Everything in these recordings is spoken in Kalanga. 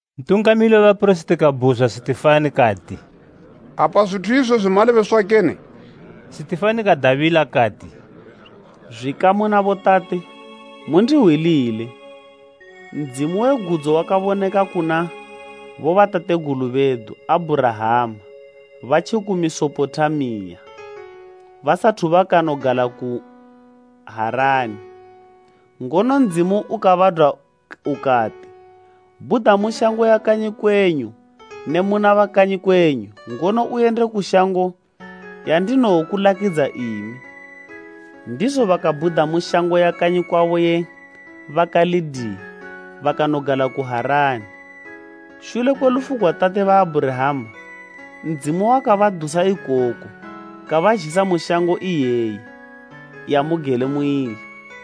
Ntungamili we bapirisiti kabhuzwa Sitifani kati, “Apa zwithu izwezwi malebeswa kene?” Sitifani kadabila kati, “Zwikamu na botate, mundihwilile! Ndzimu we gudzo wakaboneka kuna bobatategulu bedu Abhurahama batjiku Mesopotamiya, basathu bakanogala ku Harani, ngono Ndzimu ukabadwa ukati, ‘Bhuda mu shango ya kanyi kwenyu ne muna bakanyi kwenyu, ngono uyende ku shango yandinowokulakidza imi.’ “Ndizo bakabhuda mu shango ya kanyi kwabo ye ba Kalideya bakanogala ku Harani. Shule kwe lufu gwa tate ba Abhurahama Ndzimu wakabadusa ikoko ukabazhisa mu shango iyeyi yamugele muili.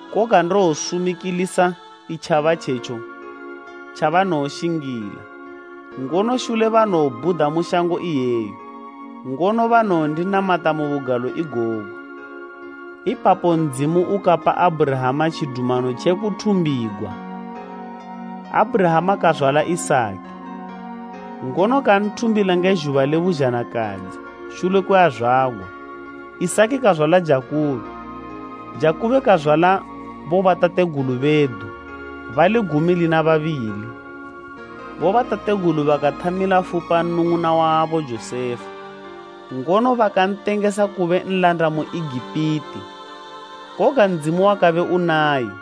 Koga ndowosumikilisa itjaba itjetjo tjabanowoshingila, ngono shule banowobhuda mu shango iyeyo, ngono banowondinamata mu bugalo igogu.’ —35:18Ipapo Ndzimu ukapa Abhurahama tjidumano tje kuthumbigwa. Abhurahama kazwala Isaki, ngono kanthumbila nge zhuba le buzhanakadzi shule kwe azwagwa. Isaki kazwala Jakubo, Jakubo kazwala bobatategulu bedu bali gumi lina babili. “Bobatategulu bakathamila fupa nnung'una wabo Josefa ngono bakantengesa kube nlanda mu Egipiti. Koga Ndzimu wakabe unaye.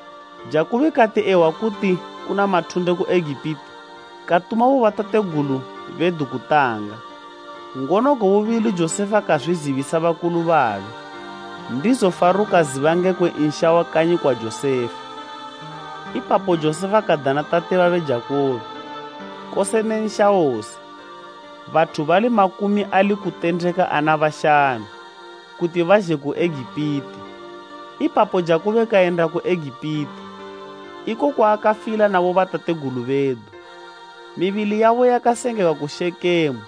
Jakubo kati ehwa kuti kuna mathunde ku Egipiti, katuma bobatategulu bedu kutanga. Ngono gwe bubili Josefa kazwizibisa bakulu babe, ndizo Faro kaziba ngekwe nsha wa kanyi kwa Josefa. Ipapo Josefa kadana tate babe Jakubo, kose ne nsha wose, bathu bali makumi ali kutendeka ana bashanu, kuti bazhe ku Egipiti. Ipapo Jakubo kayenda ku Egipiti, iko kwaakafila na bobatategulu bedu. Mibili yabo yakasengegwa ku Shekemu,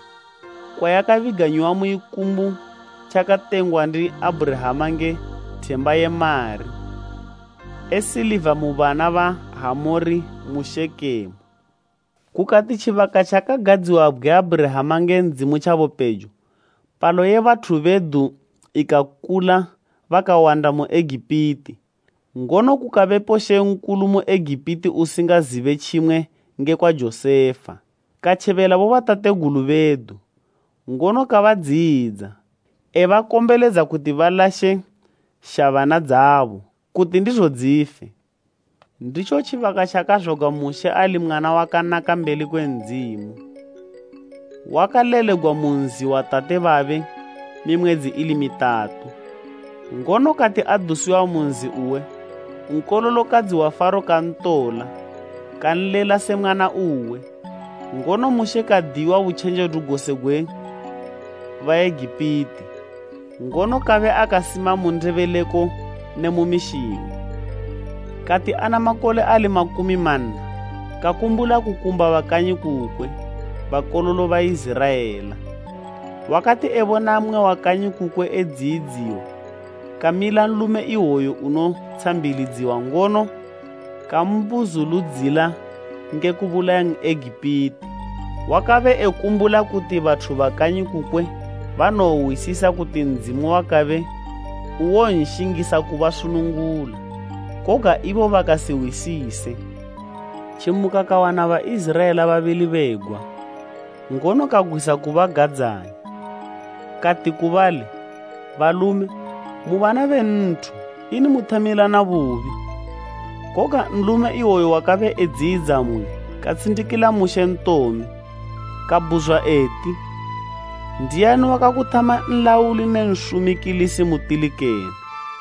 kwayakabiganyiwa mu ikumbu tjakatengwa ndi Abhurahama nge themba ye mari e siliva mu bana ba Hamori mu Shekemu. “Kukati tjibaka tjakagadziwabgwe Abhurahama nge Ndzimu tjabe pejo, palo ye bathu bedu ikakula bakawanda mu Egipiti. Ngono kukabepo mambo mu Egipiti usingazibe tjimwe ngekwa Josefa. Katjebela bobatategulu bedu, ngono kabadziyidza, ebakombeledza kuti balashe shabana dzabo, kuti ndizo dzife. Nditjo tjibaka tjakazwagwa Mushe ali mwana wakanaka mbeli kwe Ndzimu. Wakalelegwa mu nzi wa tate babe mimwedzi ili mitatu, ngono kati adusiwa mu nzi uwe, nkololokadzi wa Faro kantola kanlela se mwana uwe. Ngono Mushe kadiyiwa butjenjedu gose gwe Baegipiti, ngono kabe akasima mu ndebeleko ne mu mishingo. “Kati ana makole ali makumi manna, kakumbula kukumba bakanyi kukwe, bakololo Baiziraela. Wakati ebona mmwe wa kanyi kukwe edziyidziwa kamila nlume iwoyo unotshambilidziwa ngono kambuzuludzila nge kubulaya N'egipiti. Wakabe ekumbula kuti bathu ba kanyi kukwe banowohwisisa kuti Ndzimu wakabe uwonshingisa kubasunungula, koga ibo bakasihwisise. Tjimuka kawana Baiziraela babili begwa, ngono kagwisa kubagadzanya. Kati ku bali, ‘Balume mu bana be nthu ini muthamilana bubi?’ Koga nlume iwoyu wakabe edziyidza mmwe katshindikila Mushe ntome. Kabhuzwa eti, ‘Ndiani wakakuthama nlauli ne nsumikilisi mutili kene?’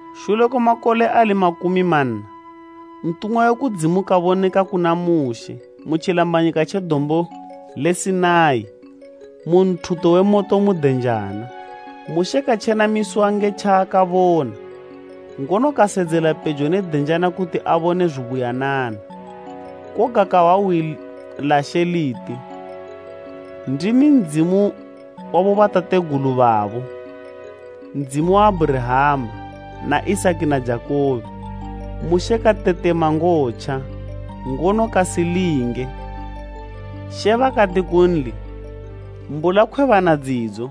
“Shule kwe makole ali makumi manna, ntumwa we kudzimu kaboneka kuna Mushe mu tjilambanyika tje Dombo le Sinai mu nthuto we moto mu denjana. Mushe katjenamisiwa nge tjaakabona, ngono kasedzela pejo ne denjana kuti abone zubuyanana. Koga kahwa hwi la She liti, ‘Ndimi Ndzimu wa bobatategulu babo, Ndzimu wa Abhurahama, na Isaki na Jakubo.’ Mushe katetema ngotja, ngono kasilinge. She bakati kunli, ‘Ambula khwebana dzidzo,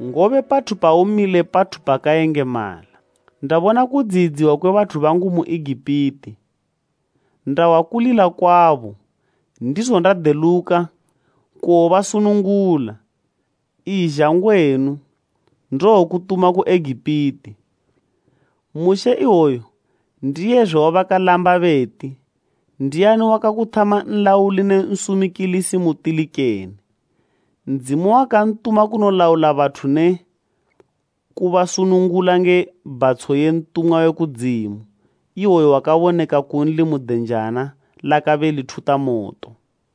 ngobe pathu paumile pathu pakayengemala. Ndabona kudziyidziwa kwe bathu bangu mu Egipiti. Ndahwa kulila kwabo, ndizo ndadeluka kuwobasunungula. Izha ngwenu; ndowokutuma ku Egipiti.’ “Mushe iwoyu ndiye zwe wabakalamba beti, ‘Ndiani wakakuthama nlauli ne nsumikilisi mutili kene?’ Ndzimu wakantuma kunolaula bathu ne kubasunungula nge bhatsho ye ntumwa we kudzimu iwoyu wakaboneka kunli mu denjana lakabe lithuta moto.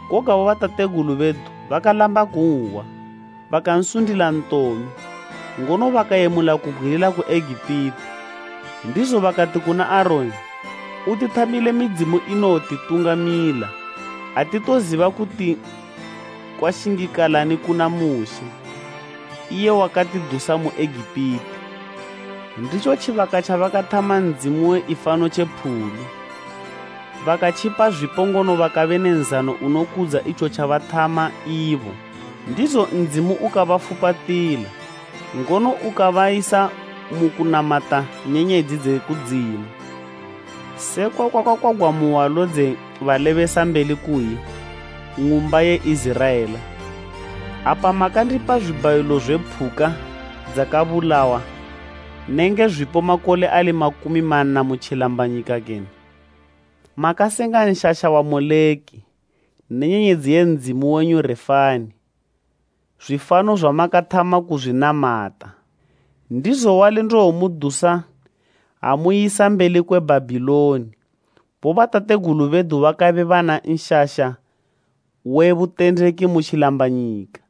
“Koga bobatategulu bedu bakalamba kunhwa, bakansundila ntome, ngono bakayemula kubgwilila ku Egipiti. Ndizo bakati kuna Aroni, ‘Utithamile midzimu inowotitungamila. Atitoziba kuti kwashingikalani kuna Mushe, iye wakatidusa mu Egipiti.’ Nditjo tjibaka tjabakathama ndzimu we ifano tje phulu, bakatjipa zwipo ngono bakabe ne nzano unokudza itjo tjabathama ibo. Ndizo Ndzimu ukabafupatila, ngono ukabayisa mu kunamata nyenyedzi dze kudzimu, sekwa kwakakwagwa mu hwalo dze balebesambeli kuyi, “ ‘Ng'umba ye Iziraela. Apa makandipa zwibhayilo zwe phuka dzakabulawa nenge zwipo makole ali makumi manna mu tjilambanyika kene? Makasenga tente ya Moleki, ne nyenyedzi ye ndzimu wenyu Refani, zwifano zwamakathama kuzwinamata. Ndizo wali ndowomudusa amuyisa mbeli kwe Bhabhiloni.’ “Bobatategulu bedu bakabe bana tente ye butendeki mu tjilambanyika.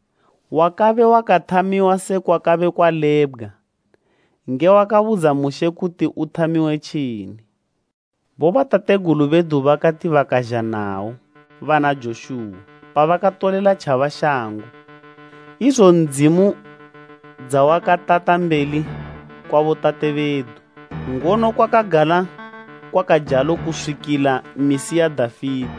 Yakabe yakathamiwa sekwakabe kwalebgwa nge wakabudza Mushe kuti ithamiwe tjini. Bobatategulu bedu bakati bakazha nayo bana Joshuwa pabakatolela tjaba shango, idzo Ndzimu dzawakatata mbeli kwa botate bedu. Ngono kwakagala kwakajalo kuswikila misi ya Dafite,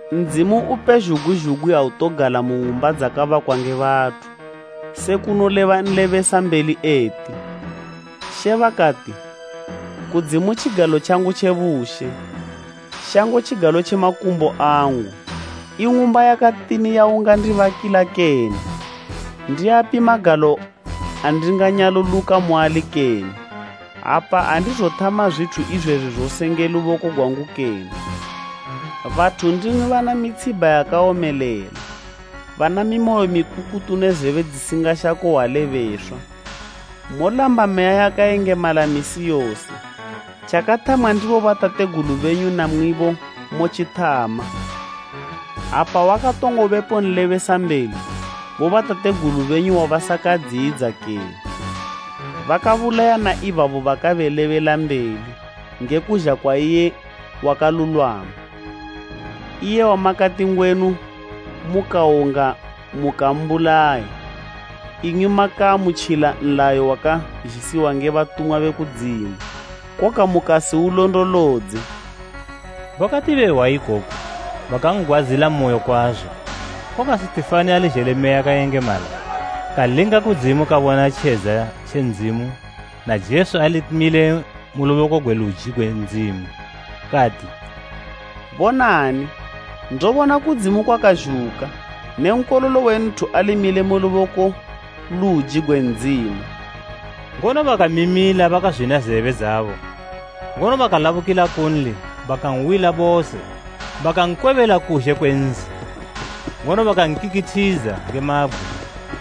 “Ndzimu upezhugwi zhugwi autogala mu ng'umba dzakabakwa nge bathu, se kunoleba nlebesambeli eti, “ ‘She bakati, kudzimu tjigalo tjangu tje bushe, shango tjigalo tje makumbo angu. I ng'umba yakatini yaungandibakila kene? Ndiapi magalo andinganyaluluka muali kene? Apa andizothama zwithu izwezwi zose nge luboko gwangu kene?’ “Bathu ndimwi bana mitshibha yakawomelela, bana mimoyo mikukutu ne zebe dzisingashako hwa lebeswa. Molamba Meya yakayengemala misi yose, tjakathamwa ndi bobatategulu benyu namwibo motjithama. Apa wakatongo bepo nlebesambeli bobatategulu benyu wabasakadziyidza kene? Bakabulaya na ibabo bakalebelambeli nge kuzha kwa iye Wakalulwama, iye wamakati ngwenu mukawonga mukambulaya. Imwi makaamutjila nlayo wakazhisiwa nge batumwa be kudzimu, koga mukasiulondolodze!” Bakati behwa ikoku bakan'gwadzilamoyo kwazo. Koga Sitifani ali zhele Meya yakayengemala, kalinga kudzimu kabona tjedza tje Ndzimu na Jesu ali mile ku luboko gwe luji gwe Ndzimu. Kati, “Bonani! Ndobona kudzimu kwakazhuka ne Nkololo we Nthu ali mile ku luboko luji gwe Ndzimu!” Ngono bakamimila bakazwina zebe dzabo ngono bakalabukila kunli bakan'wila bose. Bakankwebela kuzhe kwe nzi, ngono bakankikithidza nge mabgwe.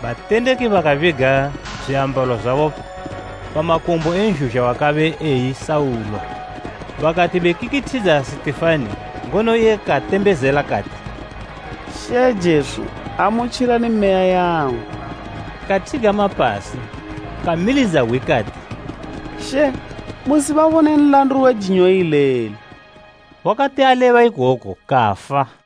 Batendeki bakabiga zwiambalo zwabo pa makumbo e nzhuzha wakabe eyi Saulo. Bakatibekikithidza Sitifani ngono iye katembezela kati, “She Jesu, amutjilani meya yangu!” Kathigama pasi kamilidza hwi kati “She! Musibabone nlandu we jinyo ileli!” Wakati aleba ikoku kafa.